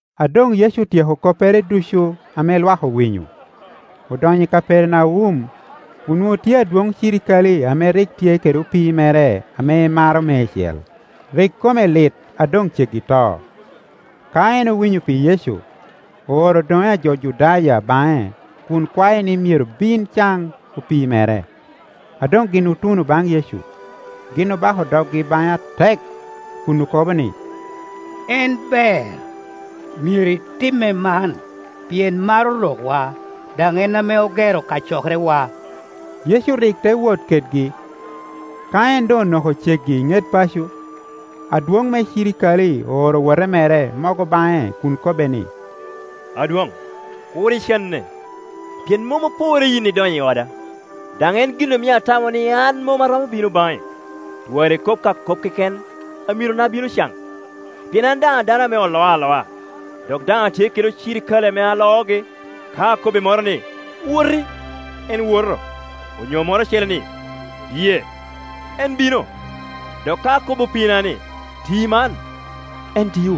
A doŋ Yecu otyeko koppere ducu ame lwak awinyo, odonyo i Kapernaum. Onwoŋo tye adwoŋ cirikale ame rik tye kede opii mere ame emaro meicel, rik kome lit a doŋ ceggi to. Ka en owinyo pi Yecu, ooro odoŋe a jo Judaya baŋe kun kwae ni myero bin caŋ opii mere. A doŋ gin otuno baŋ Yecu, gin obako doggi baŋe atek, kun okobo ni, “En ber, myero itimme man, pien maro rokwa, daŋ en ame ogero kacokerewa.” Yecu rik te wot kedgi. Ka en doŋ onoko ceggi i ŋet paco, adwoŋ me cirikale ooro owote mere mogo baŋe kun kobbe ni, “Adwoŋ, kur icanne, pien mom oporre yin idonyo i oda, daŋ en gin omio atamo ni an mom aromo bino baŋi. Twara ikob ka kop keken, amirona bino caŋ. Pien an daŋ a dano ame oloo aloa, dok daŋ atye kede cirikale ame aloogi. Ka akobbi moro ni, ‘Woti,’ en woto; onyo moro ocele ni, ‘Biye,’ en bino; dok ka akobo opiina ni, ‘Ti man,’ en tio.”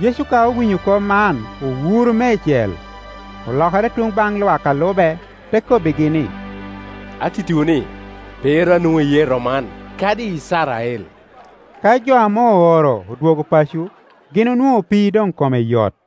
Yecu ka owinyo kop man owuro meicel, olokere tuŋ baŋ lwak a lube, te kobbigi ni, “Atittiwu ni, pe ru anwoŋo iyee a rom man, kadi i Icrael.” Ka jo ame ooro odwogo paco, gin onwoŋo opii doŋ kome yot.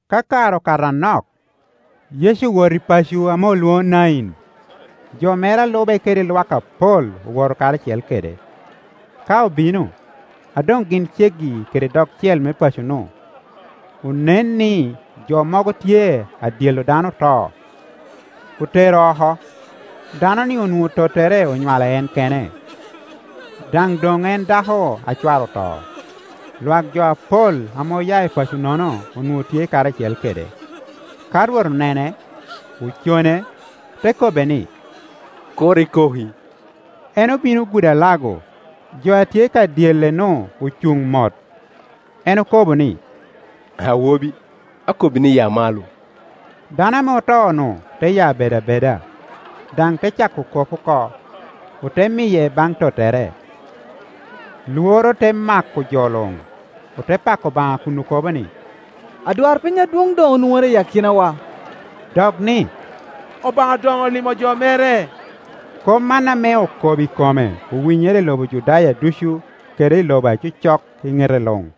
Ka kare okato anok, Yecu owoto i paco ame olwoŋo Nain; jo mere a lube kede lwak apol owoto karacel kede. Ka obino, a doŋ gin ceggi kede dogcel me paco-nu, onen ni jo mogo tye adyello dano oto, otero oko. Dano-ni onwoŋo tottere onywalo en kene, daŋ doŋ en dako a cware oto. Lwak jo apol ame oya i paco-nono onwoŋo tye karacel kede. Ka Rwot onene, ocone, te kobbe ni, “Kur ikoki.” En obino ogudo alago, jo a tye ka dyelle-nu ocuŋ mot. En okobo ni, “Awobi, akobbi ni, ya malo!” Dano ame oto-nu te ya bedo abeda, daŋ te cako kop oko. Ote miye baŋ tottere. Lworo te mako jo luŋ, ote pako Obaŋa kun okobo ni, “Adwarpiny adwoŋ doŋ onwoŋere i akinawa!” dok ni, “Obaŋa doŋ olimo jo mere!” Kop man ame okobo i kome owinyere i lobo Judaya ducu kede i lobo a cocok i ŋete luŋ.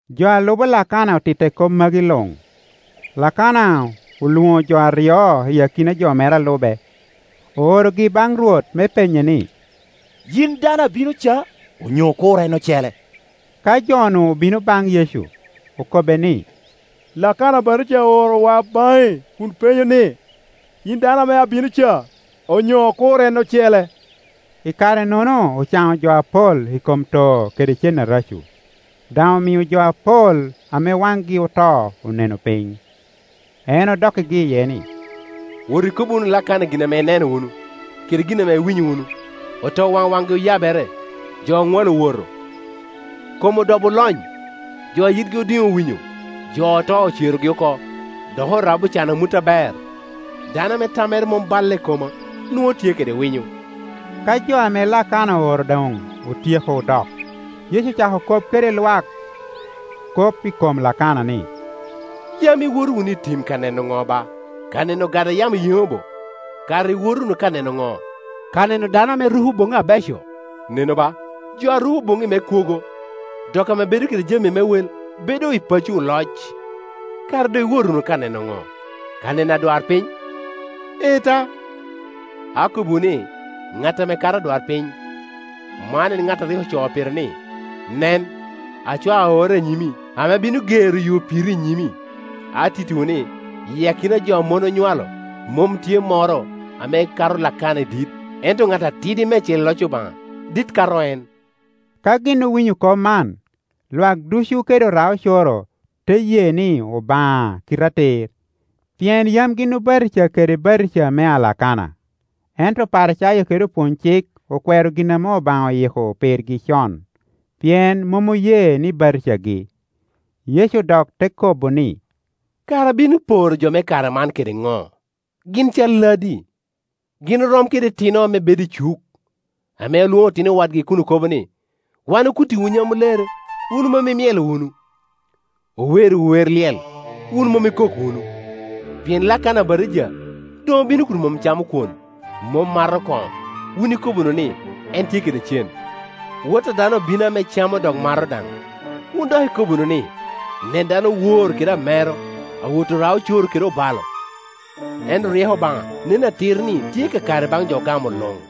Jo a lubo Lakana otitte kop magi luŋ. Lakana olwoŋo jo aryo i akina jo mere a lube, oorogi baŋ Rwot me penye ni, “Yin dano a bino ca, onyo okur en ocele?” Ka jo-nu obino baŋ Yecu, okobbe ni, “Lakana Abatija oorowa baŋi kun penyo ni, ‘Yin dano ame abino ca, onyo okur en ocele?’” I karenono ocaŋo jo apol i kom too kede cen areco, daŋ omio jo apol ame waŋgi oto oneno piny. En odokkigi iye ni, “Wot ikobbi wunu Lakana gin ame ineno wunu kede gin ame iwinyo wunu: otowaŋ waŋgi oyabere, jo oŋwalo owoto, kom odobo olony, jo a yitgi odiŋ owinyo, jo oto ocerogi oko, dok orabbi ocan amut aber. Dano ame tammere mom balle i koma nwoŋo tye kede winyo.” Ka jo ame Lakana ooro doŋ otyeko dok, Yecu ocako kop kede lwak kop i kom Lakana ni, “Yam iwoto wunu i tim ka neno ŋo ba? Ka neno ogada a yamo yeŋo bo? Kara iwoto wunu ka neno ŋo? Ka neno dano ame ruko boŋŋi abeco? Nenu ba, jo a ruko boŋŋi me kwogo, dok ame bedo kede jami me wek, bedo i pacci oloc. Kara doŋ iwoto wunu ka neno ŋo? Ka neno adwarpiny? Ee ta, akobbiwu ni, ŋat ame kato adwarpiny. Man en ŋat a rik ocoo pire ni, ‘Nen, acwao aorra i nyimi, ame bino gero yo piri i nyimi.’ Atittiwu ni, i akina jo ame mon onywalo, mom tye moro ame kato Lakana i dit; ento ŋat atidi meicel i loc Obaŋa dit kato en.” Ka gin owinyo kop man, lwak ducu kede ora-ocoro te ye ni Obaŋa kite atir, pien yam gin obatija kede batija mea Lakana. Ento Oparicayo kede opwony-cik okwero gin ame Obaŋa oyiko pirgi con, pien mom oye ni batijagi. Yecu dok te kobo ni, “Kara abino poro jo me kare man kede ŋo? Gin calladi? Gin orom kede itino ame bedo i cuk, ame lwoŋo otino wadgi kun okobo ni, ‘Wan okuttiwu nyamulere, wun mom imyelo wunu; owerriwu wer lyel, wun mom ikok wunu.’ “Pien Lakana Abatija doŋ obino kun mom camo kwon, mom mato koŋo, wun ikobo wunu ni, ‘En tye kede cen.’ Wot a dano obino ame camo dok mato daŋ, wun dok ikobo wunu ni, ‘Nen dano owor kede amero, awot ora-ocoro kede obalo.’ Ento ryeko Obaŋa nen atir ni tye kakare baŋ jo ogamo luŋ.”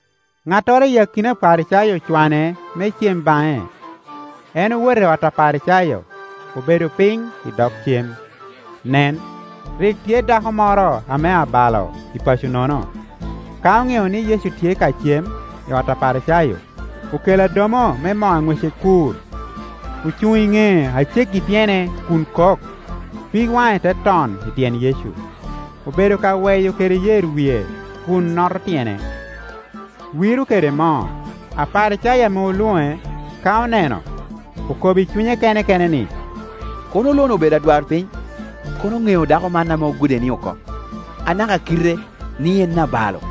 Ŋattoro i akina Oparicayo ocwane me cem baŋe; en owoto i ot Aparicayo, obedo piny i dog cem. Nen, rik tye dako moro ame abalo i paco-nono; ka oŋeo ni Yecu tye ka cem i ot Aparicayo, okelo adomo me moo a ŋwece kur, ocuŋ i ŋee a ceggi i tyene kun kok, pig waŋe te ton i tyen Yecu, obedo ka weyo kede yer wie kun noto tyene, wiro kede moo. Aparicayo ame olwoŋe, ka oneno, okobo i cunye kene kene ni, “Kono lo-ni obedo adwarpiny, kono oŋeo dako man ame ogude-ni oko, anaka kite, ni en abalo.”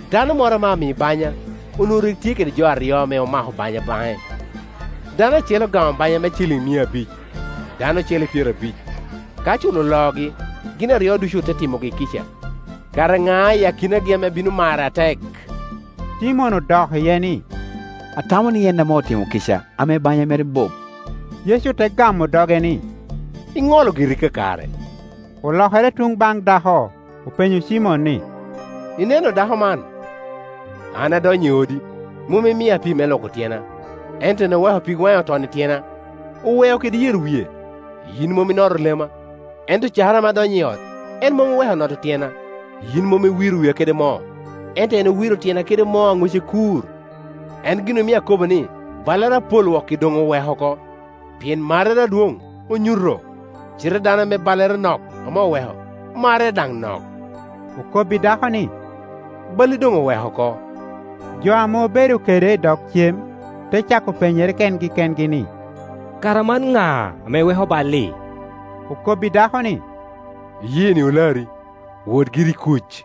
Dano moro ame ami-baŋya onwoŋo rik tye kede jo aryo ame omako banya baŋe; dano acel ocamo banya me ciliŋ Leb Grik; denari. mia abic, dano ocele pyerabic. Ka culo oloogi, gin aryo ducu ote timogi kica. Kara ŋa i akinagi ame bino mare atek?” Cimon odok iye ni, “Atamo ni en ame otimo kica ame banya mere bup.” Yecu te gamo doge ni, “Iŋolo giri kakare.” Olokere tuŋ baŋ dako, openyo Cimon ni, “Ineno dako man? An adonyo i odi, mom imia pii me lwoko tyena, ento en oweko pig waŋe oton i tyena, oweo kede yer wie. Yin mom inoto lema, ento cakere ame adonyo i ot, en mom oweko noto tyena. Yin mom iwiro wia kede moo, ento en owiro tyena kede moo a ŋwece kur. En gin omio akobo ni, ballere apol wok-ki doŋ oweko oko, pien marrere adwoŋ onyuto; cite dano ame ballere nok ame oweko, marrere daŋ nok.” Okobbi dako ni, “Balli doŋ oweko oko.” Jo ame obedo kede i dog cem te cako penyere kengi kengi ni, “Kara man ŋa ame weko bal-li?” Okobbi dako ni, “Iyeeni olari; wot giri i kuc.”